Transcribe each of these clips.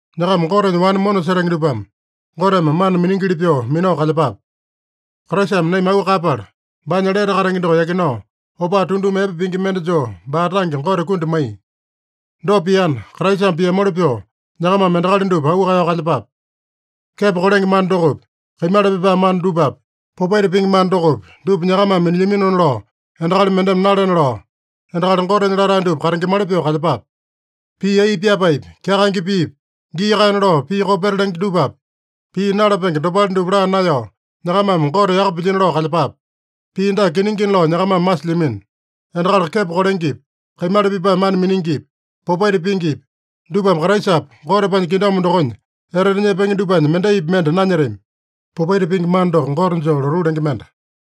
Nyakama Gotenya wane mona setenge dupame, Goteme mana miningili pyoo minao kalyepape. Kraisame naima auu kaeyapala, baanya lete katenge doko yakinao, opaa tunduma epe pingi mende joo baa tange Gote kundi maiya. Dopa piana, Kraisame piamoli pyoo nyakamame endakali dupa auu kaeyao kalyepape. Kepo kolenge mana dokopi, kaimala pipae mana dupapi, popaita pingi mana dokopi, dupa nyakamame minilyaminona lao endakali mendeme nalena lao, endakali Gotenya latae dupa katengemali pyoo kalyepape. Pii ai pyapaepi, kyakaenge piipi, gii kaena lao pii kopeta lenge dupapi, pii nalapenge dopale dupa laa naeyao, nyakamame Gote yaka pilyino lao kalyepape. Pii dake kiningina lao nyakamame masilyamino: Endakali kepo kolengepi, kaimala pipae mana miningipi, popaita pingipi, dupame Kraisapa Gotepanya kingdom dokonya etete nyepenge dupanya mendaipi mende nanyetami. (Popaita pingi mana doko gote joo lotuu lenge mende.)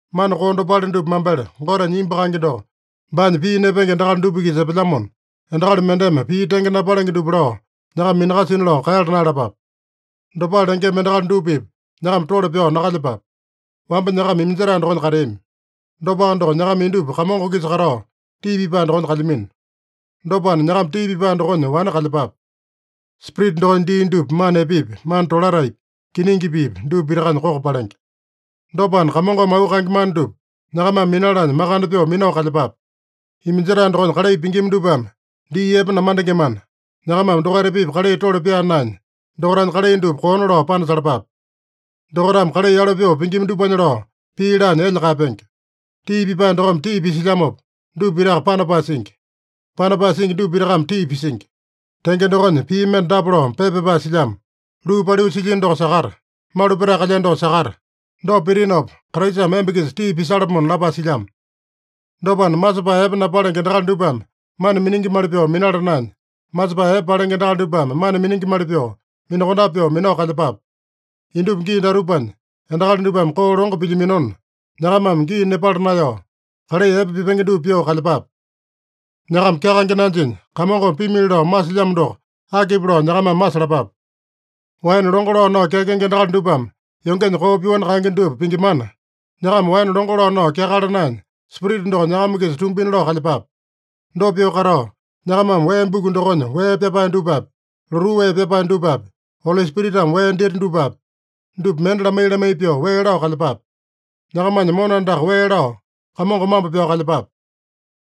Mana koo dopale dupa mambele Gotenya imbu kaenge doko baanya pii nepenge endakali dupa-kisa epelyamona, endakali mendeme pii tenge napalenge dupa lao nyakama minakasina lao kaeyala naeyalapape. Dopale lengema endakali dupa-pipa nyakama tole pyao nakalyepape. Wamba nyakama iminjetae dokonya kateami. Dopaka doko, nyakama indupa Kamongo-kisa katao tii pipae dokonya kalyamino. Dopana, nyakama tii pipae dokonya wane kalyepape. (Spirita dokonya dii dupa mana epepi, mana tolataepi, kiningi piipi, dupa pitakanya koko palenge.) Dopana, Kamongome auu kaenge mana dupa nyakamame minalanya makande pyoo minao kalyepape. Iminjetae dokonya kalai pingima dupame dii epe namandengemana, nyakamame dokaita-pipa kalai tole pyaa naenya, dokaitanya kalai dupa koona lao panasalapape. Dokaitame kalai yalo pyoo pingima dupanya lao pii laanya elya kaeyapenge. Tii pipae dokome tii pisilyamopa, dupa pitaka panapae singi. Panapae singi dupa pitakame tii pisingi. Tenge dokonya, pii mende dapa lao pepa pyapae silyamo: “Luu paliu silyino doko sakata! Malu petae kalyeno doko sakata! Dopa pitinopa, Kraisame emba-kisa tii pisalapomona” lapae silyamo. Dopana, masepae epe napalenge endakali dupame mana miningimali pyoo minala naenya, masepae epe palenge endakali dupame mana miningimali pyoo, minakondape pyoo minao kalyepape. Indupa gii datupanya endakali dupame koo longo pilyaminona, nyakamame gii nepala naeyao, kalai epe pipenge dupa pyoo kalyepape. Nyakama kyakaenge nanjinya, Kamongome pimili lao masilyamo doko akipi lao nyakamame masalapape. Waene longo lao nao kyakenge endakali dupame yongenya koo pyoani kaenge dupa pingimana, nyakama waene longo lao nao kyakala naenya, Spirita doko nyakama-kisa tumbina lao kalyepape. Dopa pyoo katao, nyakamame wee buku dokonya wee pyapae dupapi, lotuu wee pyapae dupapi, Oli Spiritame wee dita dupapi, dupa mende lamai-lamai pyoo, wee lao kalyepape. Nyakamanya mona andaka wee lao, Kamongo mambo pyao kalyepape.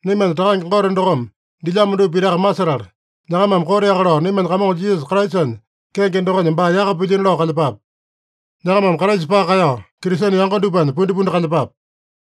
Naimanya Takange Gote dokome dilyamo dupa pitaka masetala, nyakamame koteaka lao naimanya Kamongo Jisasa Kraisanya kenge dokonya baa yaka pilyino lao kalyepape. Nyakamame Kraisa paka kaeyao, Kristene yango dupanya pundipundi kalyepape.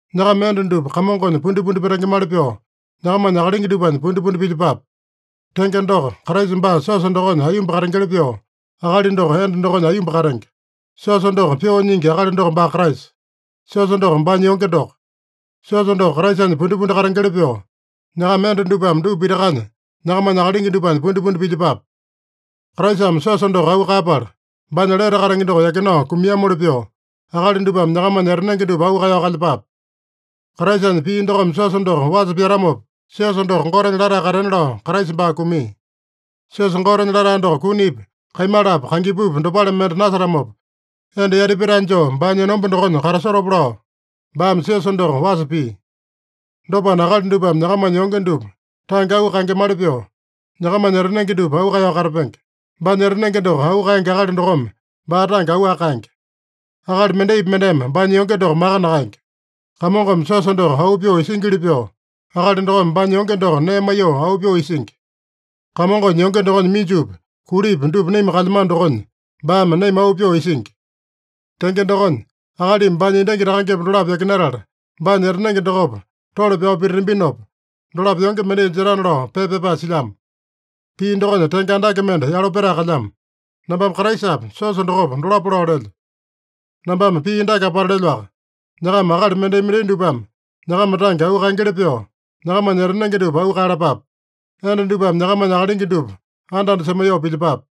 Nyakama enda dupa Kamongonya pundipundi petengemali pyoo, nyakamanya akalingi dupanya pundipundi pilyepape. Tenge doko, Kraisa baa siosa dokonya aiyomba katengeli pyoo, akali doko enda dokonya aiyomba katenge. Siosa doko pyoo nyingi akali doko baa Kraisa. Siosa doko baanya yonge doko. Siosa doko Kraisanya pundipundi katengeli pyoo, nyakama enda dupame dupa pitakanya nyakamanya akalingi dupanya pundipundi pilyepape. Kraisame siosa doko auu kaeyapala, baanya lete katenge doko yakinao kumiamoli pyoo, akali dupame nyakamanya etanenge dupa auu kaeyao kalyepape. Kraisanya pii dokome siosa doko wasa pyatamopa, siosa doko Gotenya latae katena lao Kraisa baa kumia. Siosa Gotenya latae doko kunipi, kaimalapi, kangipupi, dopale mende nasetamopa, enda yati petae joo baanya enomba dokonya katasotopa lao, baame siosa doko wasa pia. Dopana, akali dupame nyakamanya yonge dupa tange auu kaengemali pyoo, nyakamanya etanenge dupa auu kaeyao katapenge. Baanya etanenge doko auu kaenge akali dokome baa tange auwaka kaenge. Akali mendaipi mendeme baanya yonge doko maka nakaenge. Kamongome siosa doko auu pyoo isingili pyoo, akali dokome baanya yonge doko nee maiyoo auu pyoo isingi. Kamongonya yonge dokonya minjupi, kulipi dupa naima kalyamano dokonya baame naima auu pyoo isingi. “Tenge dokonya, akalimi baanya endangi takangepa dolapo yakinatala, baanya etanenge dokopa tole pyao pititambinopa, dolapo yonge mendai jetana” lao pepa pyapae silyamo. Pii dokonya tenge andake mende yalo petae kalyamo. Nambame Kraisapa, siosa dokopa, dolapo lao lelyo. Nambame pii dake apata lelyoaka: Nyakama akali mendai-mendai dupame nyakama tange auu kaengeli pyoo, nyakamanya etanenge dupa auu kaeyalapape. Enda dupame nyakamanya akalingi dupa anda-anda semaiyoo pilyepape.